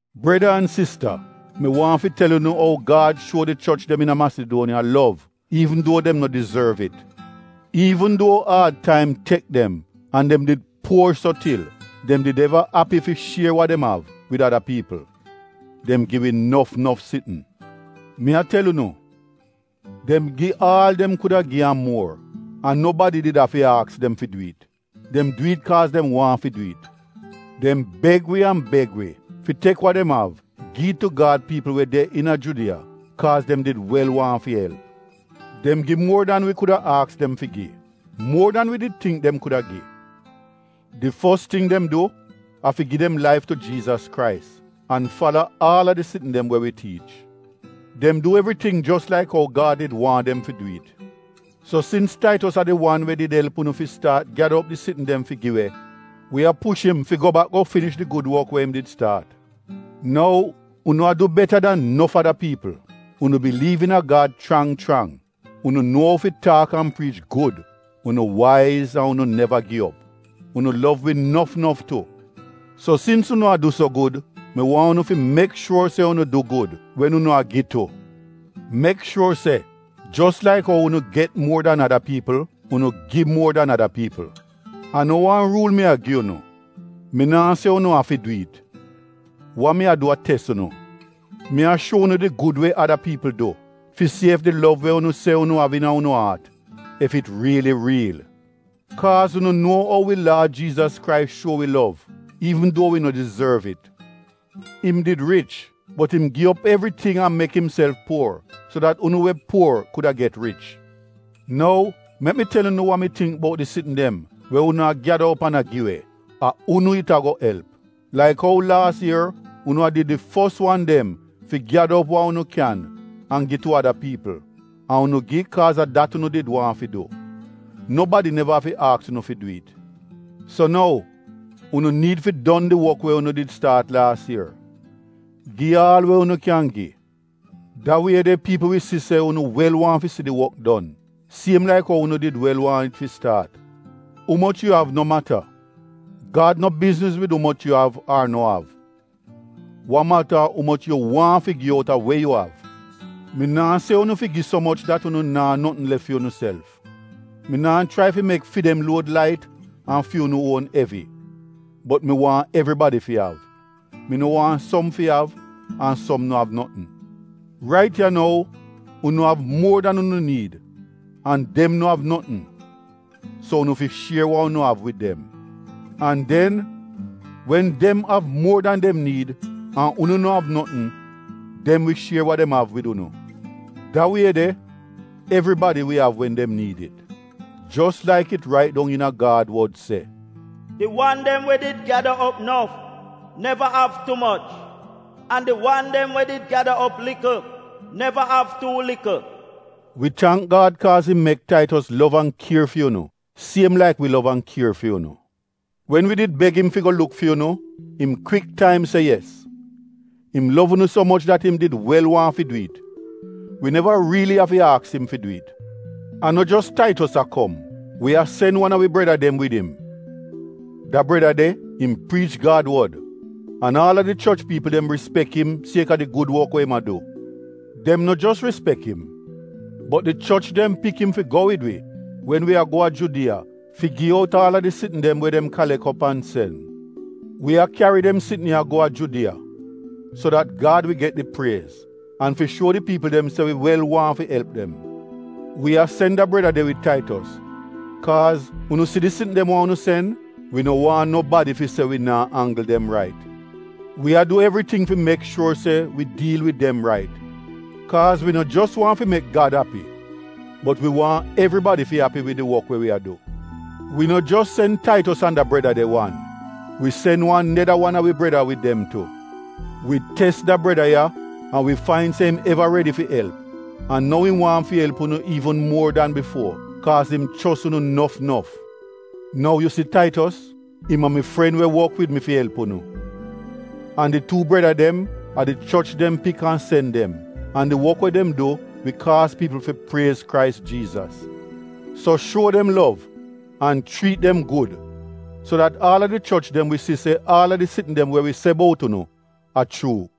Breda an Sista mi waahn fi tel unu ou Gad shuo di choch dem iina Masiduoniya lov iivn duo dem no dizorv it. Iivn duo aad taim tek dem an dem did puor so til, dem did eva api fi shier wa dem av wid ada piipl. Dem gi we nof nof sitn. Mi a tel unu, dem gi aal dem kuda gi an muor an nobadi did afi aks dem fi du it, dem du it kaaz dem waahn fi du it. Dem beg wi an beg wi fi tek wa dem av gi it tu Gad piipl dem we de iina Judiya kaaz dem did wel waahn fi elp. Dem gi muor dan wi kuda aks dem fi gi, muor dan wi did tingk dem kuda gi. Di fos ting dem du a fi gi dem laif tu Jiizas Krais an fala aal a di sitn dem we wi tiich. Dem du evriting jos laik ou Gad did waahn dem fi du it. So sins Taitos a di wan we did elp unu fi staat gyada op tingz fi gi we, wi a push im fi go bak go finish di gud wok we im did staat. Nou, unu a du beta dan nof ada piipl. Unu biliiv iina Gad chrang chrang, unu nuo ou fi taak an priich gud, unu waiz an unu neva gi op. Unu lov wi nof nof tu. So sins unu a du so gud, mi waahn unu fi mek shuor se unu du gud wen unu a gi tu. Mek shuor se jos laik ou unu get muor dan ada piipl, unu gi muor dan ada piipl. A no wan ruul mi a gi unu, mi naa se unu afi du it. Wa mi a du a tes unu. Mi a shuo unu di gud we ada piipl du, fi si ef di lov we unu se unu av iina unu aat, ef it riili riil. Kaaz unu nuo ou wi Laad Jiizas Krais shuo wi lov iivn duo wi no dizorv it. Im did rich bot im gi op evriting an mek imself puor so dat unu we puor kuda get rich. Nou mek mi tel unu wa mi tingk bout di sitn dem we unu a gyada op an a gi we: A unu it ago elp laik ou laas ier unu a did di fos wan dem fi gyada op wa unu kyan an gi tu ada piipl, an unu gi kaaz a dat unu did waahn fi du, nobadi neva afi aks unu fi du it. So nou, unu niid fi finish di wok we unu did staat laas ier. Gi aal we yu kyan gi, da wie de piipl wi si se unu wel waahn fi si di wok don siem laik ou unu di wel waahn it fi staat. Umoch yu av no mata, Gad no bizniz wid umoch yu av ar no av. Wa mata a umoch yu waahn fi gi outa we yu av. Mi naa se unu fi gi so moch dat unu naa notn lef fi unuself. Mi naa chrai fi mek fi dem luod lait an fi unu uon evi, bot mi waahn evribadi fi av, mi no waahn som fi av, an som no av notn. Rait ya nou unu av muor dan unu niid an dem no av notn, so unu fi shier wa unu av wid dem. An den wen dem av muor dan dem niid an unu no av notn, dem wi shier wa dem av wid unu. Da wie de evribadi wi av wen dem niid it. Jos laik it rait dong iina Gad wod se, “Di wan dem we did gyada op nof, neva av tu moch an di wan dem we did gyada op likl, neva av tuu likl.” Wi tangk Gad kaaz im mek Taitos lov an kier fi unu siem laik wi lov an kier fi unu. Wen wi did beg im fi go luk fi unu, im kwik taim se yes. Im lov unu so moch dat im did wel waahn fi du it — wi neva riili afi aks im fi du it. A no jos Taitos a kom, wi a sen wan a wi breda dem wid im. Da breda de, im priich Gad wod, an aal a di choch piipl dem rispek im kaaz a di gud wok we im a du. Dem no jos rispek im, bot di choch dem pik im fi go wid wi wen wi go a Judiya fi gi out aal a di sitn dem we dem kalek op an sen. Wi a kyari dem sitn ya go a Judiya, so dat Gad wi get di priez an fi shuo di piipl dem se wi wel waahn fi elp dem. Wi a sen da breda de wid Taitos kaaz unu si di sitn dem wa unu sen, wi no waahn nobadi fi se wi naa anggl dem rait. Wi a du evriting fi mek shuor se wi diil wid dem rait, kaaz wi no jos waahn fi mek Gad api, bot wi waahn evribadi fi api wid di wok we wi a du. Wi no jos sen Taitos an da breda de wan, wi sen wan neda wan a wi breda wid dem tu. Wi tes da breda ya an wi fain se im eva redi fi elp, an nou im waahn fi elp unu iivn muor dan bifuo kaaz im chos unu nof nof. Nou yu si Taitos, im a mi paadi, im wok wid mi fi elp unu. An di tuu breda dem, a di choch dem pik an sen dem, an di wok we dem du wi kaaz piipl fi priez Krais Jiizas. So shuo dem lov an chriit dem gud so dat aal a di choch dem wi si se aal a di sitn dem we wi se bout unu, a chuu.